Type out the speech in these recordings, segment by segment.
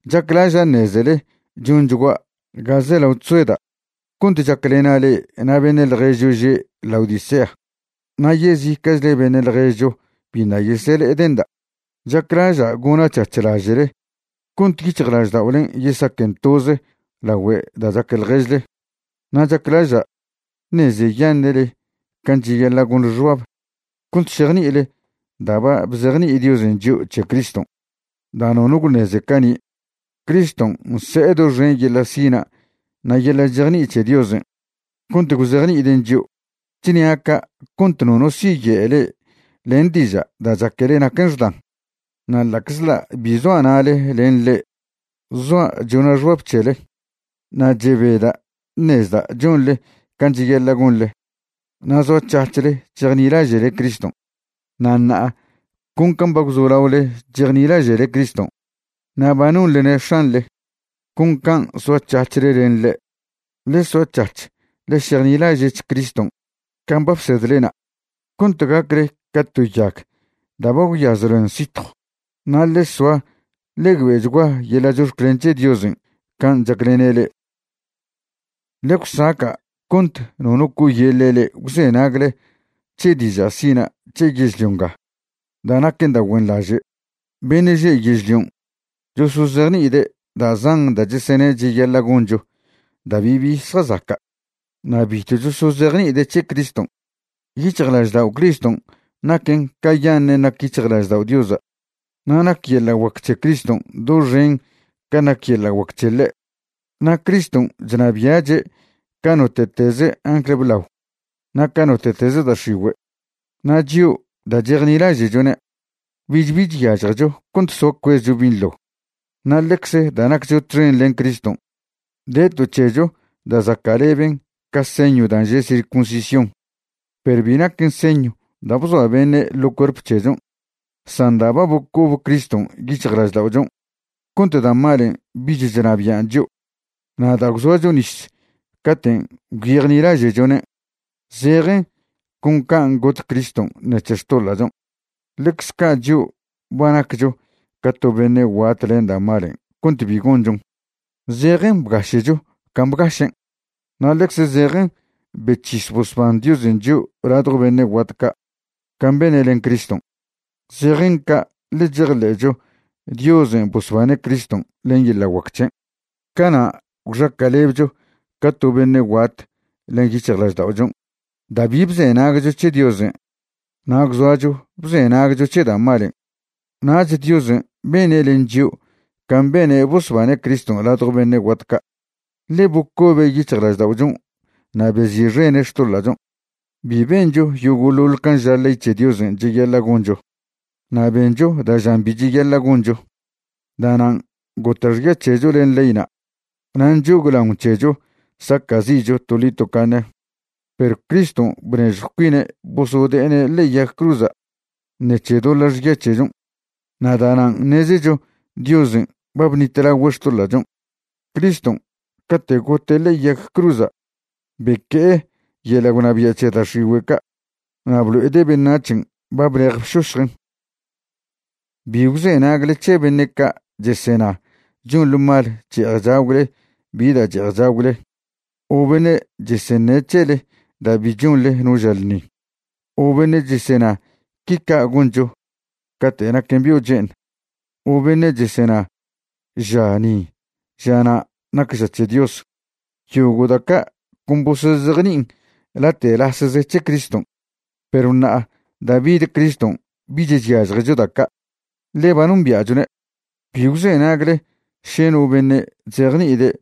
Chaclaža' ṉezele chonchgua' ga zelao chzoeda' cont chaclena' le'e na' beṉe' ḻježcho že' Laodicea na' yezica'chle beṉe' ḻježcho biṉa' yesele'ede'nda'. Chaclaža' gona' c̱hac̱h laže'le cont yic̱hjlažda'olen' yesaquen toze lagüe da' chaque ḻježle. Na' chaclaža' ṉezeyaṉe'le can' cheyaḻa' gonḻe xbab cont šejni'ile da' ba bzejni'i Diosen' chio' c̱he Criston' da' nono gwṉeze cani'. Criston' nse'e doxen yeḻa' sina' na' yeḻa' chejni'i c̱he Diosen' cont gwzejni'iden' chio'. Chnia' ca' cont nono siye'e le'e len diža' da' chaquele naquen xdan. Na' ḻa'czḻa' bi zoa' na'le len le'e, zoa' chona' xbab c̱hele na' chebeda' ṉezda' chonḻe can' cheyaḻa' gonḻe na' zoac̱hac̱hle chejnilaže'le Criston'. Na' ṉa'a, con can' ba gwzolaole chejnilaže'le Criston' na' ba nonḻene' X̱anḻe, con can' soac̱hac̱hle len ḻe'. Ḻe soac̱hac̱h ḻe šejnilaže'ch Criston' can' ba bsedlena', cont gacle ca to yag da' ba gwyaz ḻoen sitjw. Na' ḻe soa ḻe güe'chgua yeḻa' chox̱clen c̱he Diosen' can' chaclene' le'e. Ḻe gwsaca' cont nono co'oyeḻe' le'e gwzenagle c̱he diža' sina' c̱he yežlio nga da' naquen da' güenḻaže'. Beṉe' že' yežlion' chosozejni'ide' da' zan da' chesene' cheyaḻa' goncho da' bibi zjazaca', na' bitw chosozejni'ide' c̱he Criston'. Yic̱hjlaždao' Criston' naquen' cayaṉen' nac yic̱hjlaždao' Diosa', na' nac yeḻa' guac c̱he Criston' doxen can' nac yeḻa' guac c̱he ḻe'. Na' Criston' chnabia'che' ca note'teze angl blao na' ca note'teze da' x̱igüe', na' chio', da' chejnilaže'chone', bich bi chyažjecho cont soa cuezcho binḻo. Na' ḻecze da' naccho txen len Criston' de to c̱hecho da' zaca'leben ca señw da' že' circuncisión, perw bi naquen señw da' bzoa beṉe' ḻo cuerp c̱hechon', san da' ba bocob Criston' yic̱hjlažda'ochon' cont da' malen' bich chnabian' chio'. Na' da' gwzoacho nis caten' gwyejnilaže'chone', zejen con can' got Criston' ṉec̱he xtoḻa'chon', ḻecz ca' chio' ba naccho ca to beṉe' guat len da' malen' cont bi gonchon. Zejen bgaše'cho can' bgašen', na' ḻecze zejen bec̱his bosban Diosen' chio' ladjo beṉe' guat ca' can' bene' len Criston'. Zejen ca' ḻe chejḻe'cho Diosen' bosbane' Criston' len yeḻa' guac c̱hen'. Cana' gwxaca'lebcho ca to beṉe' guat len yic̱hjlažda'ochon' da' bi bzenagcho c̱he Diosen' na' gwzoacho bzenagcho c̱he da' malen'. Nach Diosen' bene' len chio' can' bene' bosbane' Criston' ladjo beṉe' guat ca', ḻe bocobe' yic̱hjlažda'ochon' na' bezi'xene' xtoḻa'chon'. Bi bencho yogo'ḻoḻ can' ža ley c̱he Diosen' cheyaḻa' goncho, na' bencho da' žan bi cheyaḻa' goncho. Da'nan' gota' xya c̱hecho len leyna' na' nchoglaon c̱hecho saca'zi'cho toḻi tocaṉe. Perw Criston' bnežjw cuine' bosode'ene' ḻe'e yag cruza' ṉec̱he doḻa' xya c̱hechon', na' da'nan' ṉezecho Diosen' ba bṉitlagüe' xtoḻa'chon'. Criston' cate' gote' ḻe'e yag cruza' beque'e yeḻa' gwnabia' c̱he da' x̱igüe' ca' na' blo'ede' beṉac̱hen' ba blej bšošjen'. Bi gwzenagle c̱he beṉe' ca' chesena chonḻe mal che'ej chagwle bi da' che'ej chagwle, o beṉe' cheseṉe' c̱hele da' bi chonḻe no ža ḻṉi, o beṉe' chesena qui ca' goncho cate' naquen bio' che'eṉ, o beṉe' chesena ža ni ža na' nac ža c̱he Dios. Yogo' da' ca' con bosozejni'in late'lasze c̱he Criston', perw ṉa'a da' bid Criston' bich chyažjecho da' ca', ḻe ba nombia'chone'. Bi gwzenagle še no beṉe' chzejni'ide'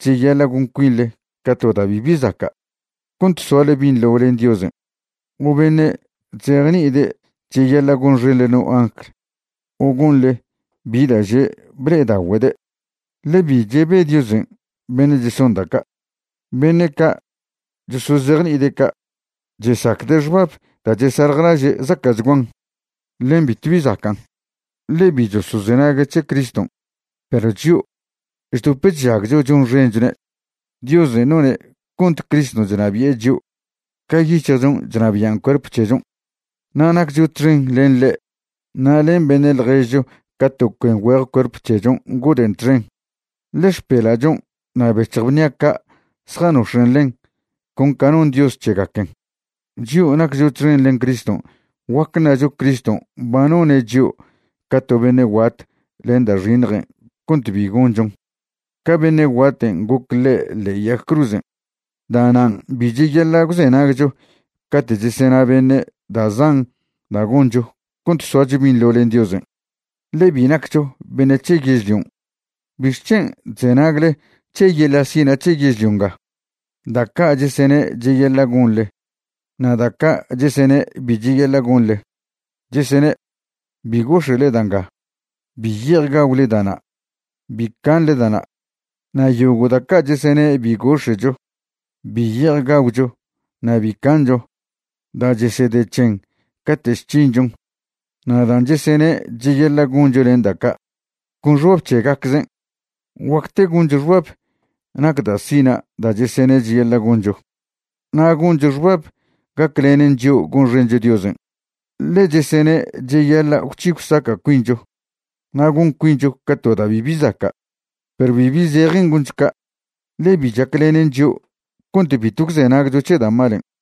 cheyaḻa' gon cuinḻe ca to da' bibi zaca' cont soale binḻo len Diosen', o beṉe' chzejni'ide' cheyaḻa' gonxenḻe no angl o gonḻe bi da' že' ble'edagüede', ḻe bi chebe Diosen' beṉe' cheson da' ca'. Beṉe' ca' chosozejni'ide' ca' chesacde' xbab da' chesaljlaže' zaca'chguan, ḻen bitw bi zacan', ḻe bi chosozenague' c̱he Criston'. Perw chio' chdop chžagcho chonxenchone', Diosen' none' cont Criston' chnabi'e chio' ca yic̱hjchon' chnabian' cuerp c̱hechon'. Na' naccho txen len ḻe' na' len beṉe' ḻježcho ca to cuen güeje cuerp c̱hechon' ngoden' txen, ḻe xpela'chon' na' bec̱hj bnia' ca' zjanox̱en' ḻen con ca non Dios c̱hegaquen. Chio' naccho txen len Criston', guac ṉacho Criston' ba none' chio' ca to beṉe' guat len da' xiṉjen' cont bi gonchon, ca beṉe' guaten' goc ḻe' ḻe'e yag cruzen'. Da'nan' bi cheyaḻa' gwzenagcho cate' chesena beṉe' da' zan da' goncho cont soacho binḻo len Diosen', ḻe bi naccho beṉe' c̱he yežlion'. ¿Bixc̱hen' chzenagle c̱he yeḻa' sina' c̱he yežlio nga da' ca' chesene' cheyaḻa' gonḻe na' da' ca' chesene' bi cheyaḻa' gonḻe? Chesene': “Bi gox̱e'le da' nga”, “Bi ye'ej gagwle da' na'”, “Bi canḻe da' na'”. Na' yogo' da' ca' chesene' bi gox̱e'cho, bi ye'ej gagwcho na' bi cancho, da' chesede c̱hen cate' chc̱hinchon, na' dan' chesene' cheyaḻa' goncho len da' ca', con xbab c̱hegaczen'. Guacte goncho xbab nac da' sina' da' chesene' cheyaḻa' goncho, na' goncho xbab gaclenen chio' gonxencho Diosen', ḻe chesene' cheyaḻa' gwc̱hi gwsaca' cuincho na' gon cuincho ca to da' bibi zaca'. Perw bibi zejen goncho ca', ḻe bi chaclenen chio' cont bitw gwzenagcho c̱he da' malen'.